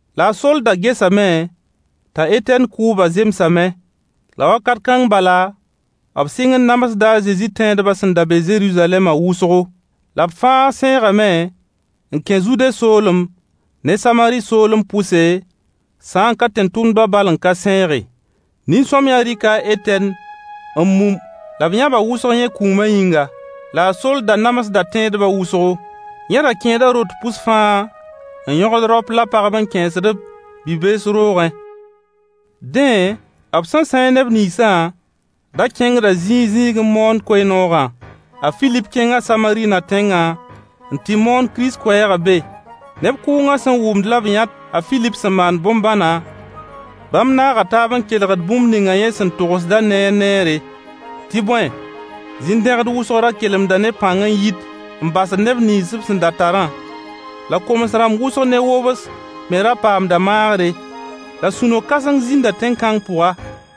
La a Soll da gesame t'a Etɛn kʋʋbã zemsame. A Soll namsda a Zezi tẽedbã La wakat kãng bala, b sɩng n namsda a Zezi tẽedbã sẽn da be Zeruzalɛma wʋsgo. La b fãa sãeegame n kẽ Zude soolem ne Samari soolem pʋse, sã n ka tẽn-tʋmdba bal n ka sãeege. Nin-sõamyã rɩka a Etɛn n mum la b yãba wʋsg yẽ kũuma yĩnga. La a Soll da namsda tẽedbã wʋsgo. Yẽ ra kẽeda rot pʋs fãa n yõgd raop la pagb n kẽesd-b bi-bees roogẽ. Dẽ, b sẽn sãeeg neb ninsã da kẽngda zĩig zĩig n moond koe-noogã. A Filip kẽnga Samari na-tẽngã n tɩ moon Kirist koɛɛgã be. Neb kʋʋngã sẽn wʋmd la b yãt a Filip sẽn maand bõn-bãna, bãmb naaga taab n kelgd bũmb ninga yẽ sẽn togsdã neer neere. Tɩ bõe, zin-dẽgd wʋsg ra kelemda ne pãng n yit n basd neb nins b sẽn da tarã. La koms-rãmb wʋsg ne wobs me ra paamda maagre. La sũ-no-kãseng zĩnda tẽn-kãng pʋga.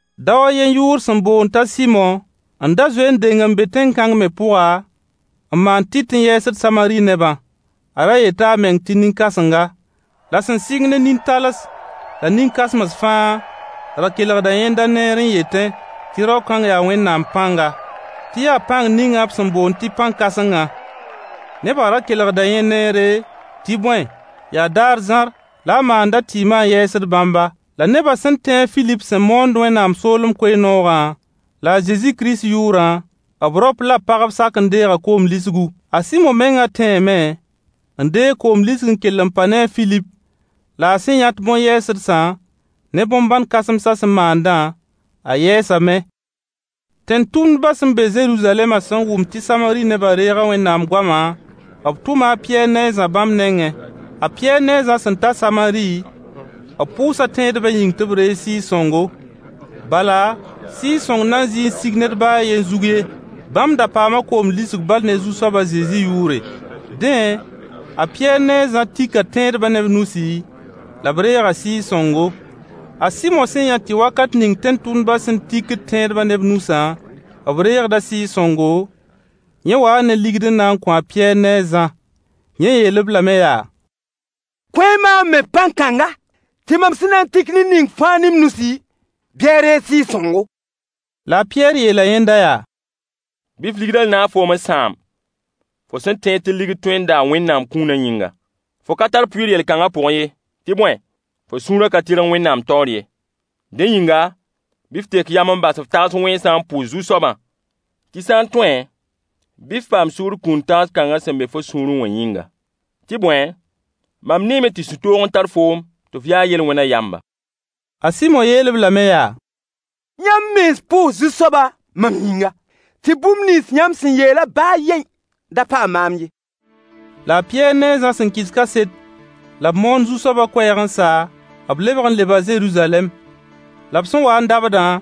Dao a yen yʋʋr sẽn boond t'a Sɩmo n da zoe n deng n be tẽn-kãng me pʋga n maand tɩt n yɛɛsd Samari nebã. A ra yeta a meng tɩ nin-kãsenga. La sẽn sɩng ne nin-tals la nin-kãsems fãa ra kelgda yẽnda neere n yetẽ tɩ rao-kãng yaa Wẽnnaam pãnga. Tɩ yaa pãng ninga b sẽn boond tɩ pãn-kãsengã. Nebã ra kelgda yẽ neere, tɩ bõe, yaa daar zãr la a maand a tɩɩmã n yɛɛsd bãmba. La neba sẽn tẽ a Filip sẽn moond Wẽnnaam soolem koe-noogã la a Zezi Kirist yʋʋrã, b raop la b pagb sak n deega koom lisgu. A Sɩmo menga tẽeme n deeg koom lisg n kell n pa ne a Filip la a sẽn yãt bõn-yɛɛsdsã ne bõn-bãn kãsemsã sẽn maandã, a yɛɛsame. Tẽn-tʋmdbã sẽn be Zeruzalɛmã sẽn wʋm tɩ Samari nebã reega Wẽnnaam goama, b tʋma a Pɩyɛɛr ne a Zã bãmb nengẽ. A Pɩyɛɛr ne a Zã sẽn ta Samari b pʋʋsa tẽedbã yĩng tɩ b reeg Sɩɩg-sõngo. Bala, Sɩɩg-sõng nan zɩɩ n sig bãmb ned ba a yen zug ye. Bãmb da paama koom lisg bal ne zu-soab a Zezi yʋʋre. Dẽ, a Pɩyɛɛr ne a Zã tika tẽedba ne b nusi, la b reega Sɩɩg-sõngo. A Sɩmo sẽn yã tɩ wakat ning tẽn-tʋmdbã sẽn tikd tẽedbã ne b nusã b reegda Sɩɩg-sõngo, yẽ waa ne ligd n na n kõ a Pɩyɛɛr ne a Zã. Yẽ yeel-b lame yaa: Kõ-y maam me pãn-kãnga tɩ mam sẽn na n tik ned ning fãa ne m nusi, bɩ a reeg Sɩɩg-sõngo. La a Pɩyɛɛr yeela yẽnda yaa: Bɩ f ligdã naag foom n sãam, fo sẽn tẽed tɩ ligd tõe n daa Wẽnnaam kũunã yĩnga. Fo ka tar pʋɩɩr yel-kãnga pʋgẽ ye. Tɩ bõe fo sũurã ka tɩrg Wẽnnaam taoor ye. Dẽ yĩnga, bɩ f tek yam n bas f tags wẽnsã n pʋʋs Zu-soabã tɩ sã n tõe bɩ f paam sugr kũun tags kãnga sẽn be fo sũurẽ wã yĩnga. Tɩ bõe, mam neeme tɩ sũ-toog n tar foo tɩ f ya yel-wẽna yamba. A Sɩmo yeel-b lame yaa: Yãmb mens pʋʋs Zu-soabã mam yĩnga, tɩ bũmb nins yãmb sẽn yeelã ba a yen da paam maam ye. La a Pɩyɛɛr ne a Zã sẽn kɩs kaset la b moon Zu-soabã koɛɛg n sa, b lebg n leba Zeruzalɛm. La b sẽn wa n dabdã,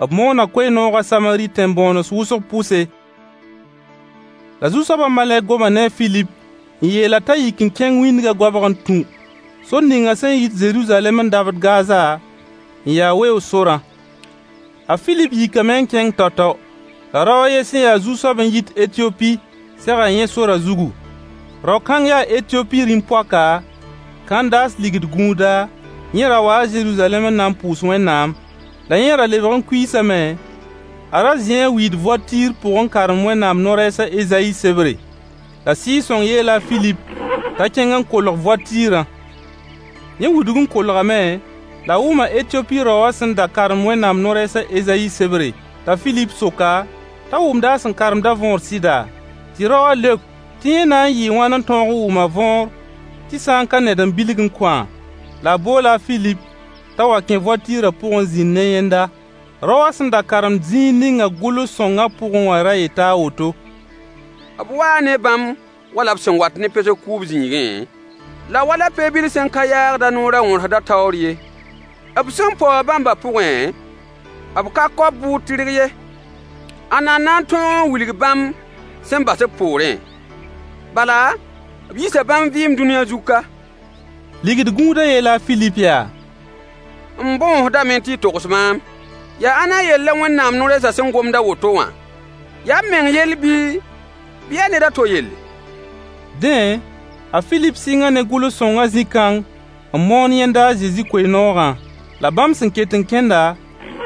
b moona koe-noogã Samari tẽn-bõones wʋsg pʋse. La Zu-soabã malɛk goma ne a Filip n yeel-a t'a yik n kẽng wĩndgã goabg n tũ sor ningã sẽn yit Zeruzalɛm n dabd Gaza, n ya weoog sorã. A Filip yikame kẽng tao-tao. La rao a yen sẽn ya zu-soab n yit Etiyopi sega yẽ sorã zugu. Rao-kãng yaa Etiyopi rĩm-poaka, Kãndaas ligd gũuda, yẽ ra waa Zeruzalɛm n na n pʋʋs Wẽnnaam. La yẽ ra lebg n kuiisame, a ra zĩi a wiid voatɩɩr pʋg n karemd Wẽnnaam no-rɛɛs a Ezayi sebre. La Sɩɩg-sõng yeela a Filip t'a kẽng n kolg voatɩɩrã. Yẽ wudg n kolgame, la a wʋma Etiyopi rao wã sẽn da karemd Wẽnnaam no-rɛɛs a Ezayi sebre, t'a Filip sok-a t'a wʋmda a sẽn karemda võor sɩda? Tɩ raowã leok tɩ yẽ na n yɩɩ wãn n tõog n wʋm a võor tɩ sã n ka ned n bilg n kõ-a. La a boola a Filip t'a wa kẽ voatɩɩrã pʋg n zĩnd ne yẽnda. Rao wã sẽn da karemd zĩig ninga gʋls-sõngã pʋgẽ wã ra yeta a woto: B waa ne bãmb wala b sẽn wat ne pesg kʋʋb zĩigẽ, la wala pe-bil sẽn ka yaagd a noor a wõrsdã ye. B sẽn paoog bãmba pʋgẽ, b ka kao b bʋʋd tɩrg ye. Ãnna n na n tõog n wilg bãmb sẽn bas b poorẽ? Bala, b yiisa bãmb vɩɩm dũniyã zug ka. Ligd-gũudã yeela a Filip yaa: M Bõosdame tɩ y togs maam. Yaa ãnna yell la Wẽnnaam no-rɛɛsã sẽn gomd a woto wã? Yaa b meng yell bii, bɩ yaa ned a to yelle? Dẽ, a Filip sɩnga ne gʋls-sõngã zĩ-kãng n moon yẽnda a Zezi koe-noogã. La bãmb sẽn ket n kẽnda,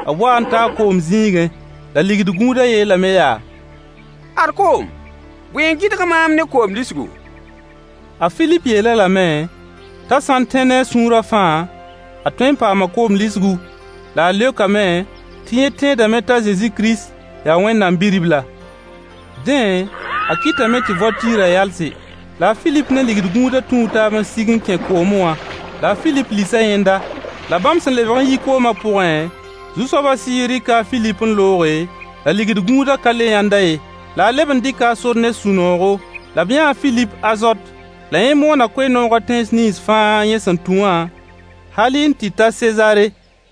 b waa n taa koom zĩigẽ. La ligd-gũudã yeelame yaa: Ad koom, bõe n gɩdg maam ne koom lisgu? [ A Filip yeel-a lame t'a sã n tẽ ne a sũurã fãa, a tõe n paama koom lisgu. La a leokame tɩ yẽ tẽedame t'a Zezi Kirist yaa Wẽnnaam Bi-ribla.] Dẽ, a kɩtame tɩ voatɩɩrã yalse. La a Filip ne ligd-gũudã tũu taab n sig n kẽ koome wã. La a Filip lisa yẽnda. La bãmb sẽn lebg n yi koomã pʋgẽ, Zu-soabã Sɩɩg rɩka a Filip n looge, la ligd-gũudã ka le yãnd-a ye. La a leb n dɩka a sor ne sũ-noogo. La b yãa a Filip Azot. La yẽ moona koe-noogã tẽns nins fãa yẽ sẽn tũ wã, halɩ n tɩ ta Sezaare.